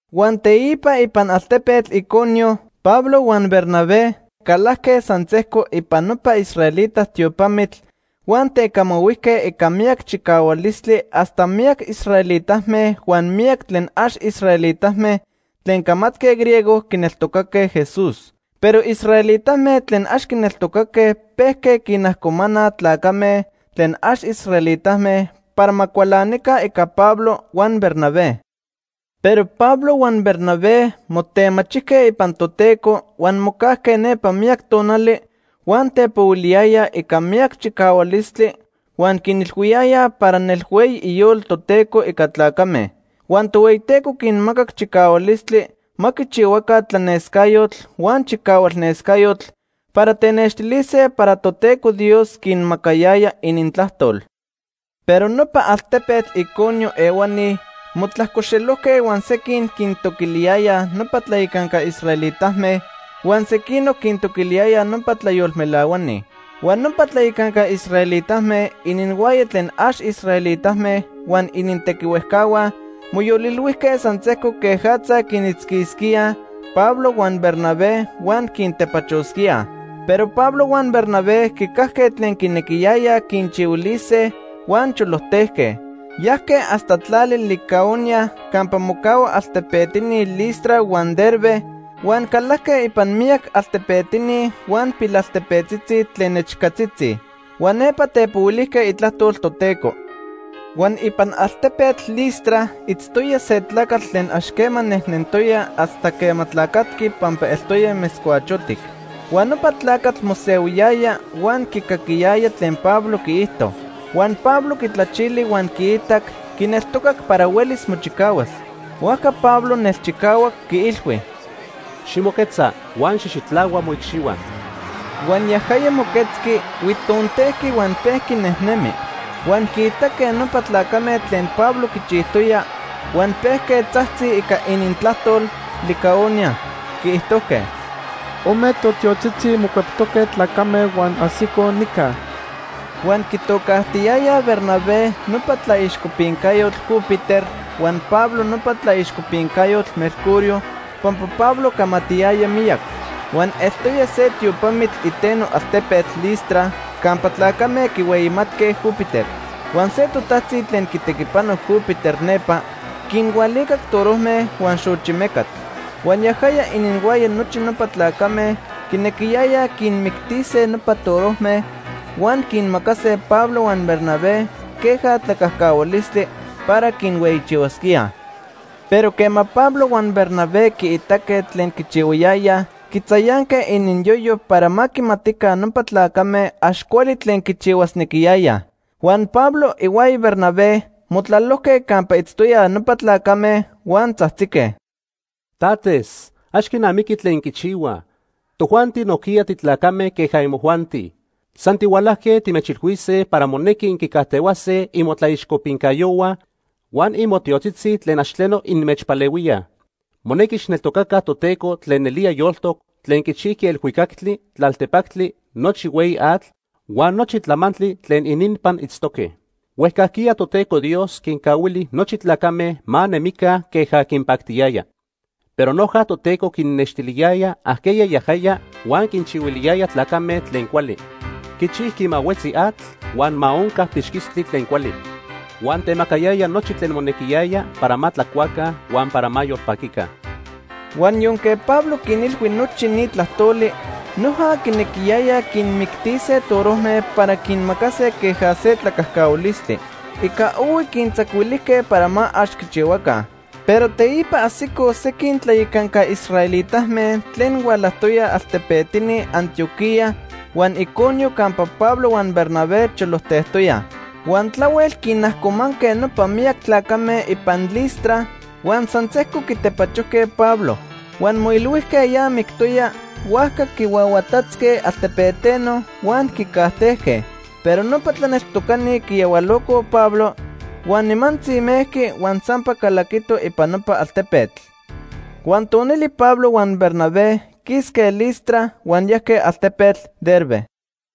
Huan teipa ipan altepetl Iconio Pablo huan Bernabé calajque san sejco ipan nopa israelita tiopamitl huan tecamahuijque ica miyac chicahualistli hasta miyac israelitame huan miyac tlen ax israelitame tlen camatque griego quineltocaque Jesús. Pero israelitame tlen ax quineltocaque pejque quinajcomanaj tlacame tlen ax israelitame para ma cualanica ica Pablo huan Bernabé. Pero Pablo huan Bernabé motemachijque ipan Toteco, huan mocajque nepa miyac tonali, huan tepohuiliyayaj ica miyac chicahualistli huan quinilhuiyayaj para nelhueyi iyolo Toteco ica tlacame. Huan Tohueyiteco quinmacac chicahualistli ma quichihuaca tlanescayotl huan chicahualnescayotl para tenextilise para Toteco Dios quinmacayaya inintlajtol. Pero nopa altepetl Iconio ehuani motlajcoxelojque huan sequin quintoquiliyayaj nopa tlayacanca israelitame, huan sequinoc quintoquiliyayaj nopa tlayolmelahuani. Huan nopa tlayacanca israelitame, ininhuaya tlen ax israelitame huan inintequihuejcahua, moyolilhuijque san sejco quejatza quinitzquisquíaj Pablo huan Bernabé huan quintepachosquíaj. Pero Pablo huan Bernabé quicajque tlen quinequiyayaj quinchihuilise huan cholojtejque. Yajque hasta tlali Licaonia campa mocahuaj altepetini Listra huan Derbe huan calajque ipan miyac altepetini huan pilaltepetzitzi tlen nechcatzitzi. Huan nepa tepohuilijque itlajtol Toteco. Huan ipan altepetl Listra itztoya se tlacatl tlen ax quema nejnentoya hasta quema tlacatqui pampa eltoya metzcuachotic. Huan nopa tlacatl mosehuiyaya huan quicaquiyaya tlen Pablo quiijto. Huan Pablo quitlachili huan quiitac quineltoca para huelis mochicahuas. Huajca Pablo nelchicahuac quiilhui: ―Ximoquetza huan xijxitlahua moicxihua. Huan yajaya moquetzqui, huitontejqui huan pejqui nejnemi. Huan quiitaque nopa tlacame tlen Pablo quichijtoya, huan pejque tzajtzij ica inintlajtol Licaonia. Quiijtojque: ―Ome totiotzitzi mocueptoque tlacame huan ajsicoj nica. Huan quitocajtiiyayaj Bernabé nopa tlaixcopincayotl Júpiter huan Pablo nopa tlaixcopincayotl Mercurio, pampa Pablo camatiyaya miyac. Huan eltoya se tiopamitl iteno altepetl Listra campa tlacame quihueyimatque Júpiter. Huan se totajtzi tlen quitequipano Júpiter nepa quinhualicac torojme huan xochi mecatl. Huan yajaya ininhuaya nochi nopa tlacame quinequiyayaj quinmictise nopa torojme, huan quinmacase Pablo huan Bernabé queja tlacajcahualistli para quinhueyichihuasquíaj. Pero quema Pablo huan Bernabé quiitaque tlen quichihuayayaj, quitzayanque ininyoyo para ma quimatica nopa tlacame ax cuali tlen quichihuasnequiyayaj. Huan Pablo ihuaya Bernabé motlalojque campa itztoyaj nopa tlacame, huan tzajtzique: ―Tates, ax quinamiqui tlen inquichihuaj. Tojuanti nojquiya titlacame queja imojuanti. San tihualajque timechilhuise para monequi inquicajtehuase imotlaixcopincayohua huan imotiotzitzi tlen ax tleno inmechpalehuíaj. Monequi xijneltocaca Toteco tlen nelía yoltoc, tlen quichijqui elhuicactli, tlaltepactli, nochi hueyi atl, huan nochi tlamantli tlen ininpan itztoque. Huejcajquiya Toteco Dios quincahuili nochi tlacame ma nemica queja quinpactiyaya. Pero noja Toteco quinnextiliyaya ajqueya yajaya huan quinchihuiliyaya tlacame tlen cuali. Quichijqui ma huetzi atl huan ma onca pixquistli tlen cuali. Huan temacayaya nochi tlen monequiyaya para ma tlacuaca huan para ma yolpaquica. Huan yonque Pablo quinilhui nochi ni tlajtoli, noja quinequiyayaj quinmictise torojme para quinmacase queja se tlacajcahualistli. Ica ohui quintzacuilijque para ma ax quichihuaca. Pero teipa ajsicoj sequin tlayacanca israelitame tlen hualajtoyaj altepetini Antioquía huan Iconio campa Pablo huan Bernabé cholojtejtoyaj. Huan tlahuel quinajcomanque nopa miyac tlacame ipan Listra huan san sejco quitepachojque Pablo. Huan moilhuijque ya mictoya, huajca quihuahuatatzque altepeteno huan quicajtejque. Pero nopa tlaneltocani quiyahualocoj Pablo, huan nimantzi mejqui huan sampa calaquito ipan nopa altepetl. Huan tonili Pablo huan Bernabé quisque Listra huan yajque altepetl Derbe.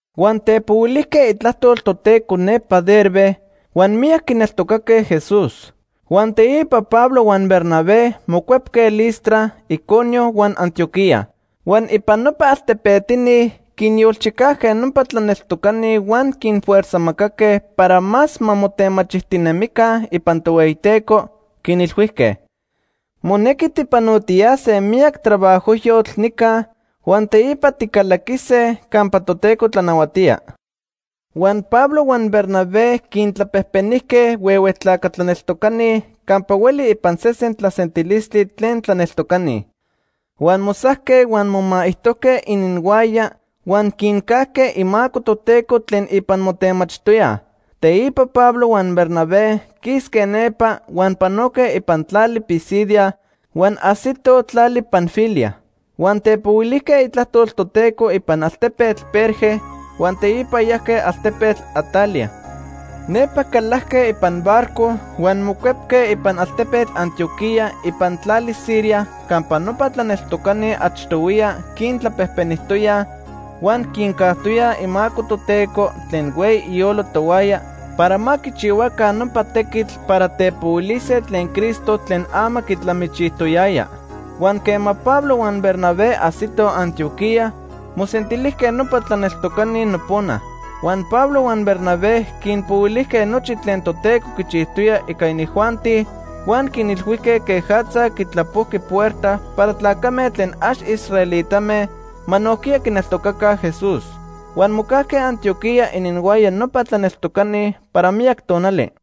Huan tepohuilijque itlajtol Toteco nepa Derbe, huan miyac quineltocaque Jesús. Huan teipa Pablo huan Bernabé mocuepque Listra, Iconio, huan Antioquía. Huan ipan nopa altepetini quinyolchicajque nopa tlaneltocani huan quinfuerzajmacaque para más ma motemachijtinemica ipan Tohueyiteco, quinilhuijque: “Monequi tijpanotiyase miyac trabajojyotl nica, huan teipa ticalaquise campa Toteco tlanahuatía.” Huan Pablo huan Bernabé quintlapejpenijque huehue tlaca tlaneltocani campa hueli ipan sesen tlasentilistli tlen tlaneltocani. Huan mosajque, huan momaijtojque ininhuaya huan quincajque imaco Toteco tlen ipan motemachijtoyaj. Teipa Pablo huan Bernabé quisque nepa huan panoque ipan tlali Pisidia huan ajsitoj tlali Panfilia. Huan tepohuilijque itlajtol Toteco ipan altepetl Perge huan teipa yajque altepetl Atalia. Nepa calajque ipan barco huan mocuepque ipan altepetl Antioquía ipan tlali Siria campa nopa tlaneltocani achtohuiya quintlapejpenijtoyaj huan quincajtoyaj imaco Toteco tlen hueyi iyolo tohuaya para ma quichihuaca nopa tequitl para tepohuilise tlen Cristo tlen ama quitlamichijtoyajya. Huan quema Pablo huan Bernabé ajsitoj Antioquía, mosentilijque nopa tlaneltocani nopona. Huan Pablo huan Bernabé quinpohuilijque nochi tlen Toteco quichijtoya ica inijuanti Huan quinilhuijque quejatza quitlapojqui puerta para tlacame tlen ax israelitame ma nojquiya quineltocaca Jesús. Huan mocajque Antioquía ininhuaya nopa tlaneltocani para miyac tonali.